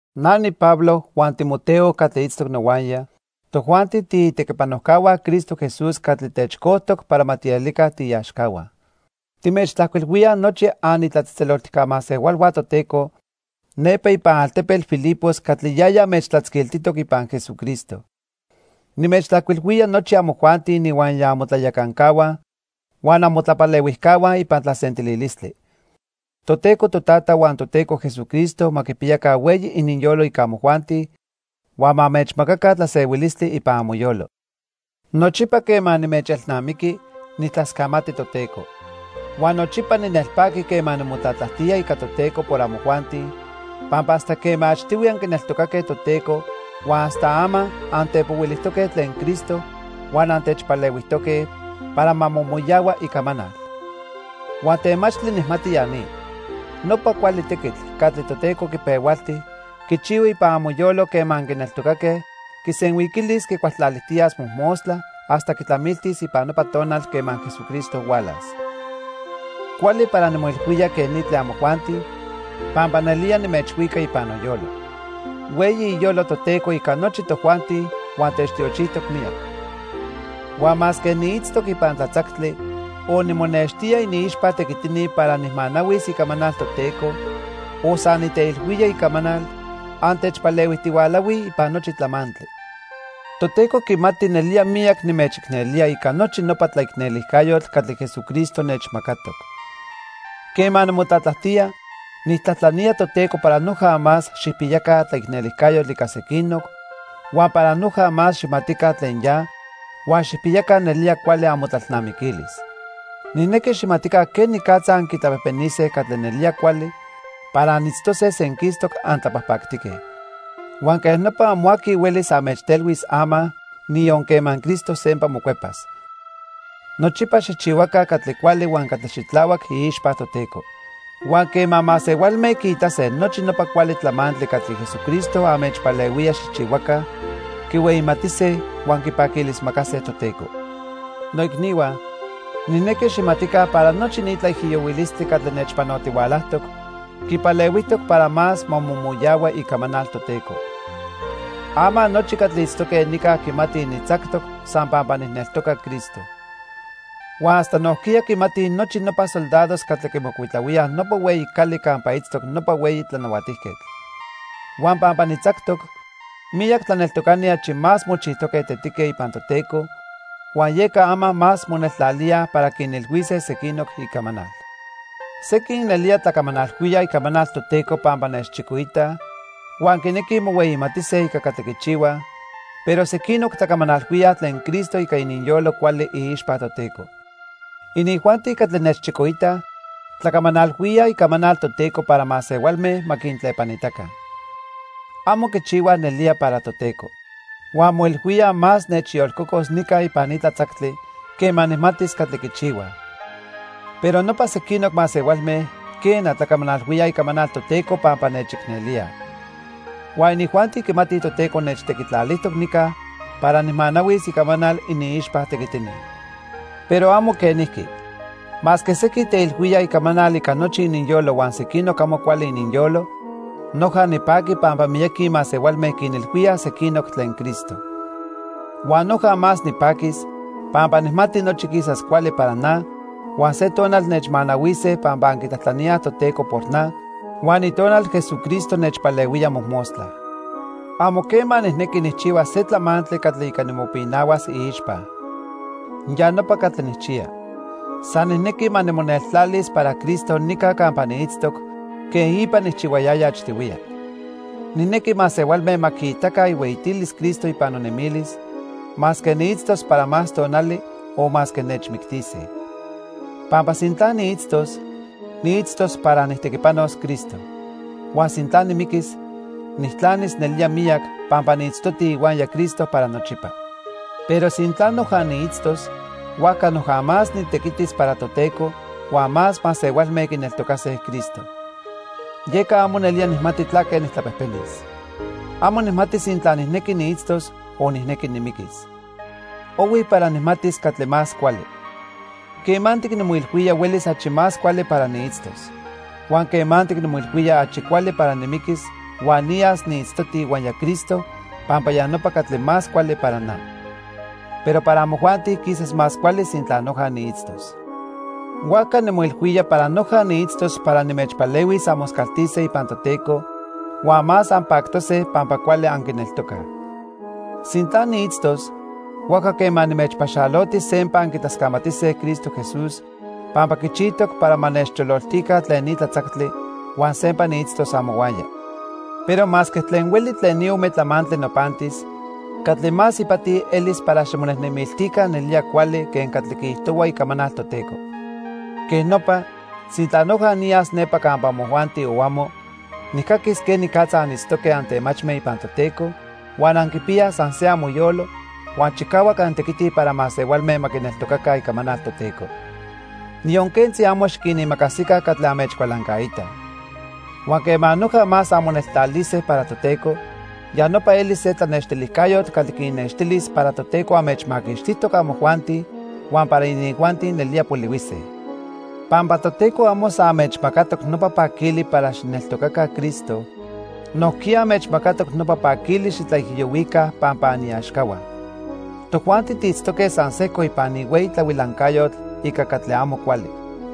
Na niPablo huan Timoteo catli itztoc nohuaya, tojuanti tiitequipanojcahua Cristo Jesús catli techcojtoc para ma tielica tiiaxcahua. Timechtlajcuilhuíaj nochi anitlatzejtzeloltijca masehualhua Toteco nepa ipan altepetl Filipos catli yaya anmechtlatzquiltijtoc ipan Jesucristo. Nimechtlajcuilhuía nochi amojuanti ininhuaya amotlayacancahua huan amotlapalehuijcahua ipan tlasentililistli. Toteco Totata huan Toteco Jesucristo ma quipiyaca hueyi ininyolo ica amojuanti, huan ma anmechmacaca tlasehuilistli ipan amoyolo. Nochipa quema nimechelnamiqui, nijtlascamati Toteco. Huan nochipa ninelpaqui quema nimotlatlajtía ica Toteco por amojuanti, pampa hasta quema achtihui anquineltocaque Toteco huan hasta ama antepohuilijtoque tlen Cristo huan antechpalehuijtoque para ma momoyahua icamanal. Huan temachtli nijmati ya ni. Nopa cuali tequitl catli Toteco quipehualti quichihua ipan amoyolo quema anquineltocaque, quisenhuiquilis quicualtlalijtiyas mojmostla hasta quitlamiltis ipan nopa tonal quema Jesucristo hualas. Cuali para nimoilhuía quej ni tlen amojuanti pampa nelía nimechhuica ipan noyolo. Hueyi iyolo Toteco ica nochi tojuanti huan techtiochijtoc miyac. Huan masque niitztoc ipan tlatzactli, o nimonextía iniixpa tequitini para nijmanahuis icamanal Toteco, o san niteilhuía icamanal, antechpalehuijtihualahuij ipan nochi tlamantli. Toteco quimati nelía miyac nimechicnelía ica nochi nopa tlaicnelijcayotl catli Jesucristo nechmacatoc. Quema nimotlatlajtía, nijtlajtlanía Toteco para noja más xijpiyaca tlaicnelijcayotl ica sequinoc, huan para noja más xijmatica tlen ya, huan xijpiyaca nelía cuali amotlalnamiquilis. Nijnequi xijmatica quenicatza anquitlapejpenise catli nelía cuali para anitztose senquistoc antlapajpactique. Huan quej nopa amo aqui huelis anmechtelhuis ama, niyon quema Cristo sempa mocuepas. Nochipa xijchihuaca catli cuali huan catli xitlahuac iixpa Toteco. Huan quema masehualme quiitase nochi nopa cuali tlamantli catli Jesucristo anmechpalehuía xijchihuaca, quihueyimatise huan quipaquilismacase Toteco. Noicnihua, nijnequi xijmatica para nochi ni tlaijiyohuilistli catli nechpanotihualajtoc quipalehuijtoc para más ma momoyahua icamanal Toteco. Ama nochi catli itztoque nica quimatij nitzactoc san pampa nijneltoca Cristo. Huan hasta nojquiya quimatij nochi nopa soldados catli quimocuitlahuíaj nopa hueyi cali campa itztoc nopa hueyi tlanahuatijquetl. Huan pampa nitzactoc, miyac tlaneltocani achi más mochijtoque tetique ipan Toteco, huan yeca ama más moneltlalíaj para quinilhuise sequinoc icamanal. Sequin nelía tlacamanalhuíaj icamanal Toteco pampa nechchicoitaj huan quinequij mohueyimatise ica catli quichihuaj, pero sequinoc tlacamanalhuíaj tlen Cristo ica ininyolo cuali iixpa Toteco. Inijuanti catli nechchicoitaj tlacamanalhuíaj icamanal Toteco para masehualme ma quintlepanitaca. Amo quichihuaj nelía para Toteco. Huan moilhuíaj más nechyolcocos nica ipan ni tlatzactli quema nijmatis catli quichihuaj. Pero nopa sequinoc masehualme, quena, tlacamanalhuíaj icamanal Toteco pampa nechicnelíaj. Huan inijuanti quimatij Toteco nechtequitlalijtoc nica para nijmanahuis icamanal iniixpa tequitini. Pero amo quenijqui. Masque sequin teilhuíaj icamanal ica nochi ininyolo huan sequinoc amo cuali ininyolo, noja nipaqui pampa miyaqui masehualme quinilhuíaj sequinoc tlen Cristo. Huan noja más nipaquis, pampa nijmati nochi quisas cuali para na huan se tonal nechmanahuise pampa anquitlajtlaníaj Toteco por na huan Itonal Jesucristo nechpalehuía mojmostla. Amo quema nijnequi nijchihuas se tlamantli catli ica nimopinahuas iixpa. Ya nopa catli nijchiya. San nijnequi ma nimoneltlalis para Cristo nica campa niitztoc quen ipa nijchihuayaya achtihuiya. Nijnequi masehualme ma quiitaca ihueyitilis Cristo ipan nonemilis, masque niitztos para más tonali o masque nechmictise. Pampa sintla niitztos, niitztos para nijtequipanos Cristo. Huan sintla nimiquis, nijtlanis nelía miyac, pampa niitztoti ihuaya Cristo para nochipa. Pero sintla noja niitztos, huajca noja más nitequitis para Toteco huan más masehualme quineltocase Cristo. Yeca amo nelía nijmati tlaque nijtlapejpenis. Amo nijmati sintla nijnequi niitztos o nijnequi nimiquis. Ohui para nijmatis catli más cuali. Quemantic nimoilhuía huelis achi más cuali para niitztos. Huan quemantic nimoilhuía achi cuali para nimiquis huan niyas niitztoti ihuaya Cristo pampa ya nopa catli más cuali para na. Pero para amojuanti quisas más cuali sintla noja niitztos. Huajca nimoilhuía para noja niitztos para nimechpalehuis anmoscaltise ipan Toteco huan más anpactose pampa cuali anquineltocaj. Sintla niitztos, huajca quema nimechpaxaloti sempa anquitlascamatise Cristo Jesús pampa quichijtoc para ma nechchololtica tlen ni tlatzactli huan sempa niitztos amohuaya. Pero masque tlen hueli tlen ni ome tlamantli nopantis, catli más ipati elis para ximonejnemiltica nelía cuali quen catli quiijtohua icamanal Toteco. Quej nopa, sintla noja niyas nepa campa amojuanti o amo, nijcaquis quenicatza anitztoque antemachme ipan Toteco, huan anquipiyaj san se amoyolo, huan chicahuac antequitij para masehualme ma quineltocaca icamanal Toteco. Niyon quentzi amo xiquinimacasica catli anmechcualancaitaj. Huan quema noja más anmoneltlalise para Toteco, ya nopa elis se tlanextilijcayotl catli quinnextilis para Toteco anmechmaquixtijtoc amojuanti huan para inijuanti nelía polihuise. Pampa Toteco amo san anmechmacatoc nopa paquili para xijneltocaca Cristo, nojquiya anmechmacatoc nopa paquili xitlaijiyohuica pampa aniaxcahua. Tojuanti tiitztoque san sejco ipan ni hueyi tlahuilancayotl ica catli amo cuali.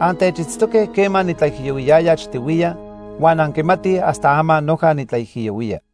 Antechitztoque quema nitlaijiyohuiyaya achtihuiya huan anquimatij hasta ama noja nitlaijiyohuía.